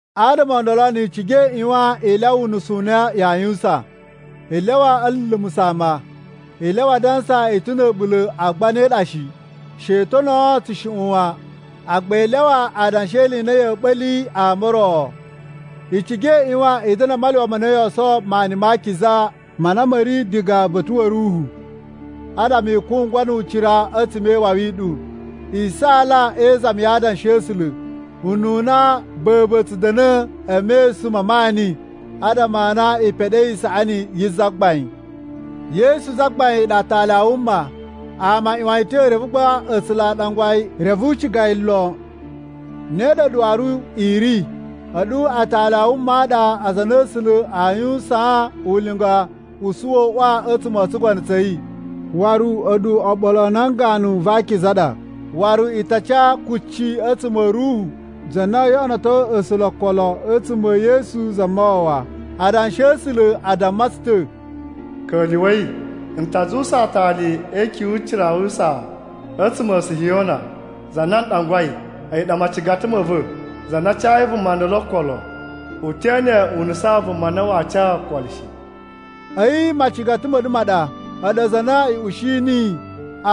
Adama o ndolo ni i ciga i ꞌyuwan i lyawa unusu u na yaa yuwusan. I lyawa a̱ lulumusa̱ ama. I lyawa a dansa i ta̱ na̱ a̱ɓula̱ agba ne ɗa shi. She i tonoo tsushuꞌun wan, agba i lyawa adanshi e ili i na ya̱a̱ ɓa̱li ama o ro. I ciga i ꞌyuwan i da̱na̱ a maluwa ma na yoo sowo maani ma akiza ma na ma̱ ri diga uba̱ta̱ wa̱ Ruhu, adama i kungwa nu ucira a̱tsuma̱ e iwawi i ɗu. I saala e izami ya adanshi a̱ A̱sula̱ ununa ba̱ba̱ tsu da̱na̱ e mesun ma maani, adama a na i peɗei isaꞌani yi Zagbain. Yesu Zagbain a̱yi ɗa Aatali a wuma. Ama a ꞌyuwan yi ta̱, reve gba A̱sula̱ a ɗangwa yi reve u ciga yi lon. Ne ɗa a̱ɗu waru i ri. A̱ɗu atali a wuma a ɗa aza a na A̱sula̱ aa yuwusaan ulinga u suwa uꞌwa a̱tsuma̱ o tsugono tsa̱ yi. Waru a̱ɗu oɓolo a nan ganu va akiza a ɗa, waru i ta ca kucci a̱tsuma̱ a̱ Ruhu, za na oo yoꞌonoto A̱sula̱ okolo a̱tsuma̱ e Yesu Zamawawa. Adanshi a̱ A̱sula̱ a damma tsu ta̱: “Ka̱lyuwa̱i! N ta zuwusa aatali e ikyun yu ucira yu usaa a̱tsuma̱ a Sihiyona, za na n ɗangwai, a̱yi ɗa macigata ma̱ va̱. Za na cayi vuma ndolo okolo, u te ene u nusan vuma na waa ca okolo shi.” A̱yi macigata ma̱ ɗu ma ɗa, a̱ɗu aza a na i ushi niyi.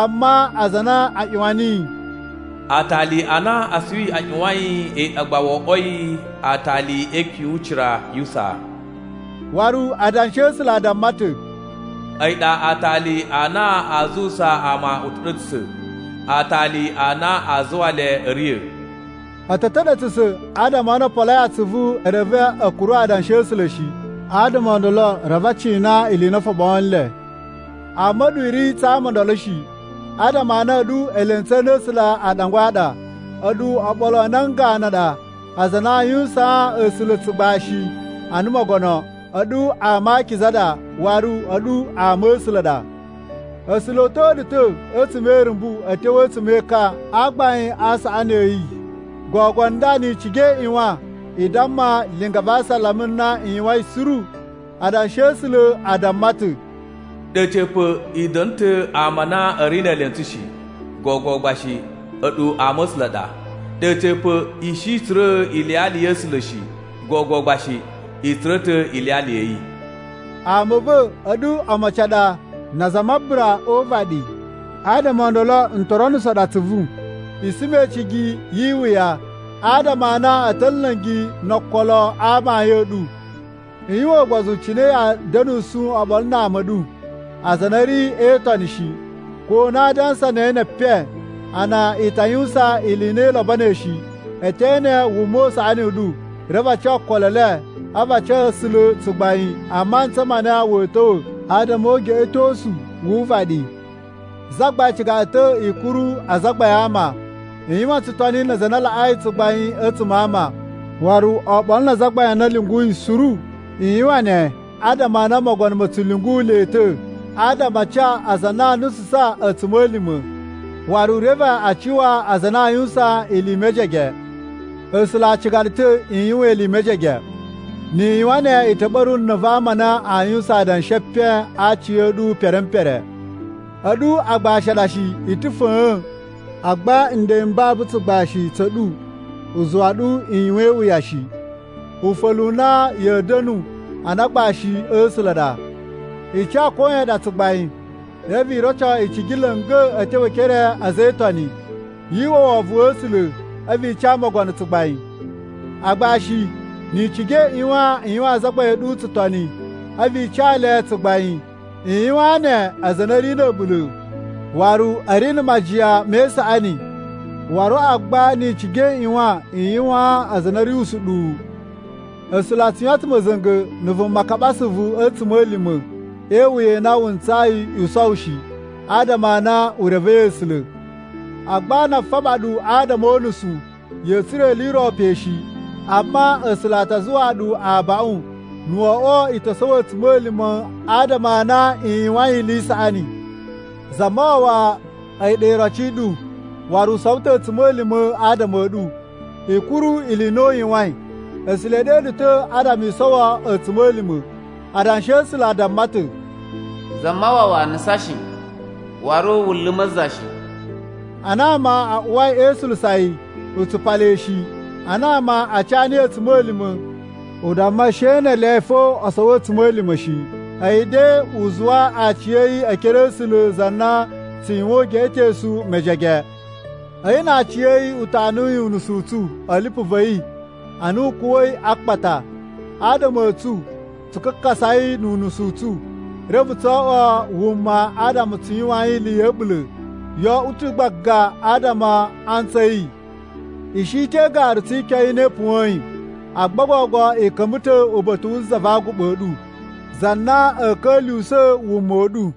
Amma aza a na a ꞌyuwan niyi, “Aatali a na asuwi a ꞌyuwain a̱yi ɗa gba wo oꞌwoi aatali e ikyun yu ucira yu usaa.” Waru Adanshi a̱ A̱sula̱ a damma ta̱, “A̱yi ɗa aatali a na aa zuwusa ama uta̱ɗa̱tsa̱sa̱, aatali a na aa zuwa le a̱ riya̱.” A̱ ta̱ ta̱ɗa̱tsa̱sa̱ adama a na o poloi atsuvu reve a̱ kuru Adanshi a̱ A̱sula̱ shi. Adama o ndolo reve a cina ili i na o foɓoo nle. Amma a̱ɗu i ri tsa ama o ndolo shi, adama a na a̱ɗu elentsu a na A̱sula̱ a ɗangwai a ɗa. A̱ɗu oɓolo a nan ganu a ɗa aza a na aa yuwusaan A̱sula̱ tsugbashi ana Mogono, a̱ɗu ama a akiza a ɗa, waru a̱ɗu ama a̱ A̱sula̱ a ɗa. A̱sula̱ o uta̱a̱ ɗu ta̱ a̱tsuma̱ e irumbu a̱ tyo a̱tsuma̱ e ekan a gbain a saꞌani a̱ yi. Gogo nda ni i ciga i ꞌyuwan i damma linga va asalama na u yuwain suru. Adanshi a̱ A̱sula̱ a damma ta̱, “Ɗe a̱ca̱pa̱ i da̱na̱ ta̱ ama a na a̱ ri ne elentsu shi; gogo gba shi a̱ɗu ama a̱ A̱sula̱ ɗa. Ɗe a̱ca̱pa̱, i shi i tsura̱ iliyali ya̱ A̱sula̱ shi, gogo gba shi, i tsura̱ ta̱ iliyali ya̱ yi.” Ama a̱ va̱, a̱ɗu omocin a ɗa na aza a mabura o uvaɗi. Adama o ndolo n to ronuso ɗu atsuvu i suma icigi yi iwuya adama a na a̱ ta̱ nla̱ngi no okolo a amayun a̱ ɗu. I yuwan ugbozu cine ya̱a̱ da̱nusu oɓolo na ama a̱ ɗu aza a na a̱ ri e itoni shi. Ko na aa dansa ne epen, a na i ta yuwusan ili i na i lobonoi shi, e te ene wuma u saꞌani u ɗu, reve a ca okolo e le a̱vu a ca A̱sula̱ tsugbain a mantsa ma na wa̱a̱ ta̱wa̱ adama o ugeꞌetosu wu uvaɗi. Zagbain ciga ɗu ta̱ i kuru azagbain a ama. I yuwan tsutoni na aza a na laꞌai tsugbain a̱tsuma̱ a ama, waru oɓolo na azagbain a na u lyunguyi suru. I yuwan ne adama a na mogono ma̱ tsu lyungu le ta̱ adama a ca aza a na aa nususan a̱tsuma̱lima̱, waru reve a cuwa aza a na aa yuwusan ili i mejege. A̱sula̱ a ciga ɗu ta̱ i yuwan ili i mejege. Ni i yuwan ne, i ta̱ ɓa̱ru na̱ va ama a na a yuwain adanshi e epen a aci a̱ ɗu pere m pere. A̱ɗu agbashi a ɗa shi i ta̱ fa̱a̱n. Agba nden m babu tsugbashi tsa̱ ɗu u zuwa ɗu i yuwan iwuya shi. Ufa̱lu u na ya̱a̱ da̱nu ana agbashi a̱ A̱sula̱ a ɗa. I ca koyan ɗa tsugbain, reve i roco icigi la̱nga̱ a̱ tyo e ekere a̱ a̱za̱ e Itoni. Yu uwwa wovon wa̱ A̱sula̱, a̱vu i ca mogono tsugbain. Agbashi, ni i ciga i ꞌyuwan i yuwaan azagbain a̱ ɗu tsutoni, a̱vu i ca le tsugbain. I yuwaan ne aza a na a̱ ri na̱ a̱ɓula̱ waru a̱ ri na̱ majiyan me isaꞌani, waru agba ni i ciga i ꞌyuwan i yuwaan aza a na a̱ ri usuɗuwu. A̱sula̱ a tsu yuwan ta̱ ma̱za̱nga̱ na̱ vuma kaɓa asuvu a̱ a̱tsuma̱lima̱ e iwuya i na wu ntsayi i sowo shi adama a na u revei A̱sula̱. Agba na a faba ɗu adama o unusu, ya̱a̱ tsura̱ ili i ro pe shi. Amma A̱sula̱ a ta zuwaa ɗu abaꞌun na̱ wo oꞌwo i to sowo a̱tsuma̱lima̱ adama a na i yuwain ili i saꞌani. Zamawawa a̱yi ɗa iroci i ɗu, waru u sowo ta̱ a̱tsuma̱lima̱ adama a̱ ɗu. I kuru ili i na u yuwain. A̱sula̱ e ɗe ɗu ta̱ adama i sowo a̱tsuma̱lima̱. Adanshi a̱ A̱sula̱ a damma ta̱: “Zamawawa nusan shi, waru wu luma̱ za shi.” Ana ama a uwai e isulusa yi, u tsupa le shi. Ana ama a ca niyi a̱tsuma̱lima̱ u damma she ne ele fo o sowo a̱tsuma̱lima̱ shi. A̱yi de u zuwa aciya̱yi e ekere a̱ A̱sula̱ za na tsu yuwan ugeꞌetosu mejege. A̱yi na aciya̱yi u tanuyi unusu u tsu a̱ lipu va̱ yi ana u kuwa̱i a akpata, adama a̱tsu tsu kakasai nu unusu u tsu, reve tso oꞌwo wuma adama tsu yuwain ili ya̱ a̱ɓula̱. Yo oꞌwo ta̱ gbaga adama a antsu a̱ yi! I shi ta̱ e igaru tsi ikyon i na i puwa̱in. Agba gogo i ka̱mba̱ ta̱ uba̱ta̱ wu Za va Aguɓa ɗu, za na a̱a̱ ka̱lyuwusa̱ wuma u ɗu.